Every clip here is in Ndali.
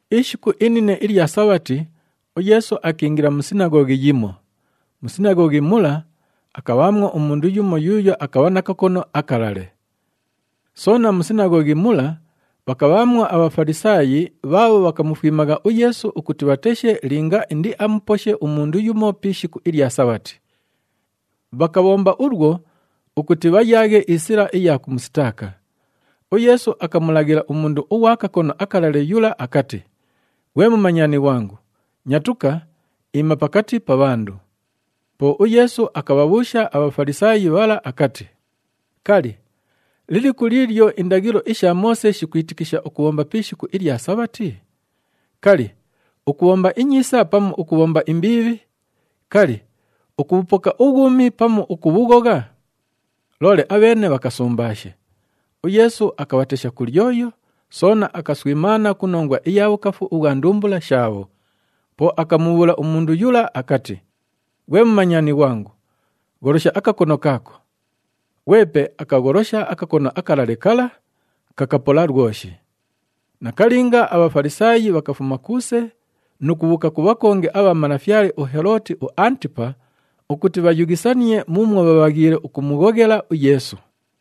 Ishiku inine ilya Sabhati, uYeesu akiingila mu sinaghoghi yimo. Mu sinaghoghi mula, akabhaamwo umundu yumo yuuyo akabha na kakono akalale. Soona mu sinaghoghi mula, bhakabhaamwo aBhafalisaayi bhaabho bhakamufwimagha uYeesu ukuti bhateshe linga indiamuposhe umundu yumo pi ishiku ilya Sabhati. Bhakabhomba ulwo, ukuti bhayaaghe isila iya kumusitaaka. UYeesu akamulaghila umundu ughwa kakono akalale yula akati, “Ghwe mumanyani ghwangu, nyatuka, iima pakati pa bhandu.” Po uYeesu akabhabhuusha aBhafalisaayi bhala akati, “Kali, liliku liilyo indaghilo isha Moose shikwitikisha ukubhomba pi ishiku ilya Sabhati? Kali, ukubhomba inyiisa pamu ukubhomba imbiibhi? Kali, ukubhupoka ubhwumi pamu ukubhughogha?” Loole abheene bhakasumbaashe. UYeesu akabhatesha ku lyoyo, soona akaswimaana ku nongwa iya bhukafu ubhwa ndumbula shaabho. Po akamubhuula umundu yula akati, “Ghwe mumanyani ghwangu, gholosha akakono kaako.” Ghwepe akagholosha akakono akalale kala, kakapola lwoshi. Nakalinga, aBhafalisaayi bhakafuma kuuse nu kubhuuka ku bhakongi abha malafyale uHelooti uAntipa ukuti bhayughisanie muumwo bhabhaghiile ukumughoghela uYeesu.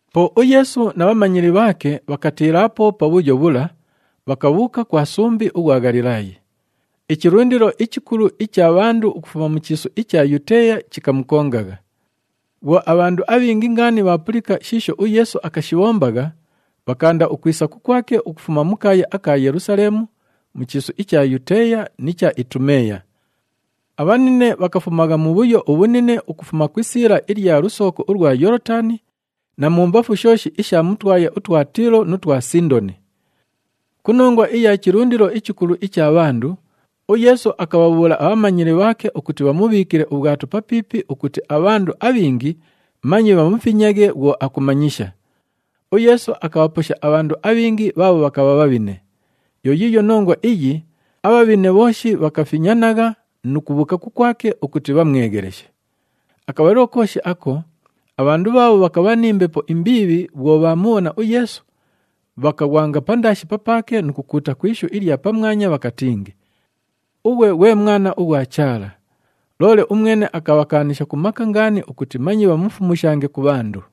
Po uYeesu na bhamanyili bhaake bhakatiilaapo pabhuyo bhula, bhakabhuuka kwa sumbi ughwa Ghalilaayi. Ichilundilo ichikulu icha bhandu ukufuma mu chiisu icha Yuteeya chikamukongagha. Bhwo abhandu abhingi ngaani bhaapulika shiisho uYeesu akashibhombagha, bhakaanda ukwisa kukwake ukufuma mu kaaya aka Yelusaleemu, mu chiisu icha Yuteeya ni cha Itumeeya. Abhanine bhakafumagha mubhuyo ubhunine ukufuma ku isiila ilya lusooko ulwa Yoolotani na mumbafu shooshi isha mu twaya utwa Tiilo nu twa Sindoni. Ku nongwa iya chilundilo ichikulu icha bhandu, uYeesu akabhabhuula abhamanyili bhaake ukuti bhamubhiikile ubhwato papiipi ukuti abhandu abhingi manye bhamufinyaghe bhwo akumanyisha. UYeesu akabhaposha abhandu abhingi bhaabho bhakabha bhabhine. Yo yiiyo nongwa iyi abhabhine bhooshi bhakafinyanagha nu kubhuuka kukwake ukuti bhamwegheleshe. Akabhalilo kooshi ako abhandu bhaabho bhakabha ni mbepo imbiibhi bhwo bhaamubhona uYeesu, bhakaghwanga pandaashi papaake nu kukuuta ku ishu ilya pamwanya bhakatingi, “Ughwe ghwe Mwana ughwa Chaala!” Loole umwene akabhakaanisha ku maka ngaani ukuti manye bhamufumushange ku bhandu.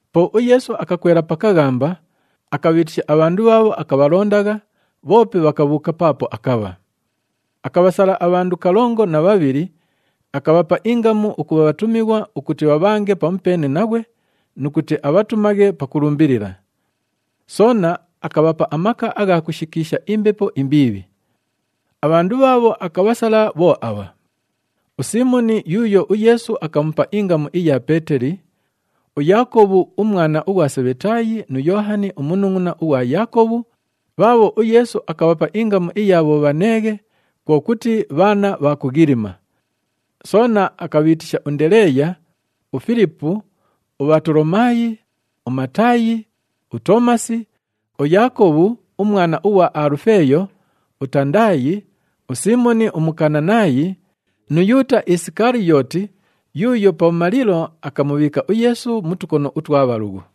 Po uYeesu akakwela pa kaghamba, akabhiitisha abhandu bhaabho akabhalondagha, bhoope bhakabhuuka paapo akabha. Akabhasala abhandu kalongo na bhabhili, akabhapa ingamu ukubha bhatumighwa ukuti bhabhange pamupeene naghwe nu kuti abhatumaghe pakulumbilila. Soona akabhapa amaka agha kushikiisha imbepo imbiibhi. Abhandu bhaabho akabhasala bho abha: uSiimoni yuuyo uYeesu akamupa ingamu iya Peeteli, uYaakobhu umwana ughwa Sebhetaayi nu Yoohani umunungʼuna ughwa Yaakobhu, bhaabho uYeesu akabhapa ingamu iya Bhobhaneeghe, kwo kuti, “Bhaana bha Kughilima.” Soona akabhiitisha uNdeleeya, uFilipu, uBhatolomaayi, uMataayi, uToomasi, uYaakobhu umwana ughwa Alufeeyo, uTandaayi, uSiimoni uMukananaayi nu Yuuta Isikaliyooti yuuyo pabhumalilo akamubhiika uYeesu mu tukono utwa bhalughu.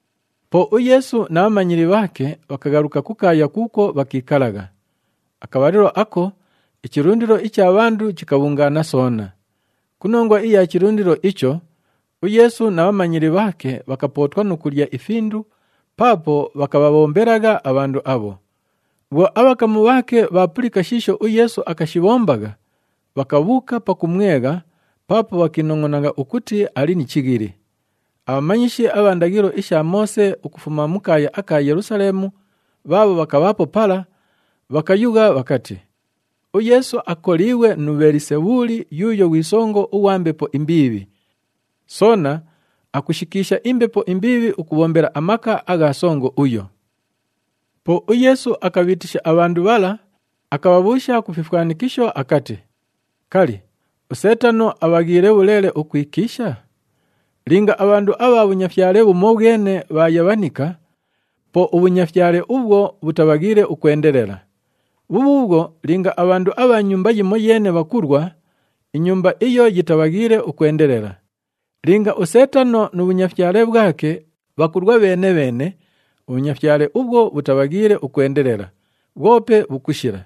Po uYeesu na bhamanyili bhaake bhakaghaluka ku kaaya kuukwo bhakiikalagha. Akabhalilo ako ichilundilo icha bhandu chikabhungaana soona. Ku nongwa iya chilundilo icho, uYeesu na bhamanyili bhaake bhakapootwa nu kulya ifindu paapo bhakabhabhombelagha abhandu abho. Bhwo abhakamu bhaake bhaapulika shiisho uYeesu akashibhombagha, bhakabhuuka pakumwegha, paapo bhakiinongʼona ukuti ali ni chighili. Abhamanyishi abha ndaghilo isha Moose ukufuma mu kaaya aka Yelusaleemu bhaabho bhakabhaapo pala, bhakayugha bhakati, “UYeesu akoliighwe nu Bhelisebhuli yuuyo ghwi songo ughwa mbepo imbiibhi. Soona akushikiisha imbepo imbiibhi ukubhombela amaka agha songo uyo.” Po uYeesu akabhiitisha abhandu bhala, akabhabhuusha ku fifwanikisho akati, “Kali, uSeetano abhaghiile bhuleele ukwikiisha? Linga abhandu abha bhunyafyale bhumobhwene bhaayabhanika, po ubhunyafyale ubhwo bhutabhaghiile ukwendelela. Bhubhuubhwo, linga abhandu abha nyumba yimoyeene bhakulwa, inyumba iyo yitabhaghiile ukwendelela. Linga uSeetano nu bhunyafyale bhwake bhakulwa bheene-bheene, ubhunyafyale ubhwo bhutabhaghiile ukwendelela, bhwope bhukushila.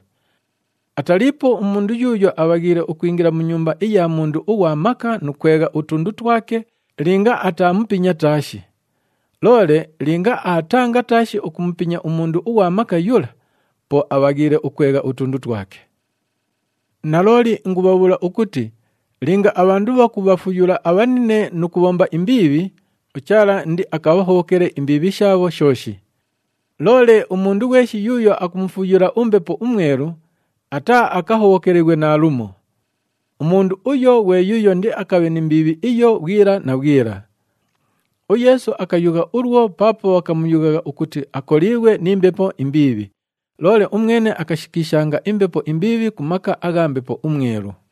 Ataliipo umundu yuuyo abhaghiile ukwingila mu nyumba iya mundu ughwa maka nu kwegha utundu twake linga ataamupinya taashi. Loole linga aatanga taashi ukumupinya umundu ughwa maka yula, po abhaghiile ukwegha utundu twake. “Nalooli ingubhabhuula ukuti linga abhandu bhakubhafuyula abhanine nu kubhomba imbiibhi, uChaala indiakabhahobhokele imbiibhi shaabho shooshi. Loole umundu ghweshi yuuyo akumufuyula uMbepo uMwelu, ataaakahobhokelighwe naalumo. Umundu uyo ghwe yuuyo indiakabhe ni mbiibhi iyo bhwila na bhwila.” UYeesu akayugha ulwo paapo bhakamuyughagha ukuti akoliighwe ni mbepo imbiibhi, loole umwene akashikiishanga imbepo imbiibhi ku maka agha Mbepo uMwelu.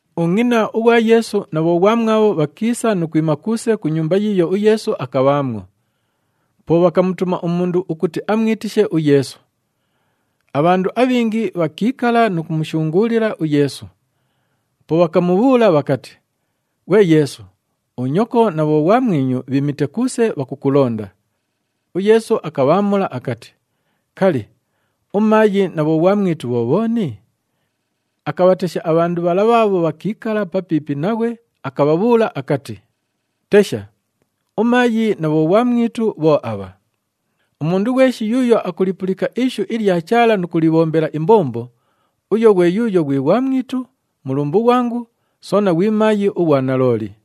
Ungʼina ughwa Yeesu na bhoghwamwabho bhakiisa nu kwima kuuse ku nyumba yiiyo uYeesu akabhaamwo. Po bhakamutuma umundu ukuti amwitishe uYeesu. Abhandu abhingi bhakiikala nu kumushunguulila uYeesu. Po bhakamubhuula bhakati, “Ghwe Yeesu, unyoko na bhoghwamwinyu bhiimite kuuse, bhakukulonda.” UYeesu akabhaamula akati, “Kali, umaayi na bhoghwamwitu bho bhooni?” Akabhatesha abhandu bhala bhaabho bhakiikala papiipi naghwe, akabhabhuula akati, “Tesha, umaayi na bhoghwamwitu bho abha! Umundu ghweshi yuuyo akulipulika ishu ilya Chaala nu kulibhombela imbombo, uyo ghwe yuuyo ghwi ghwamwitu, mulumbu ghwangu soona ghwi maayi ughwa nalooli.”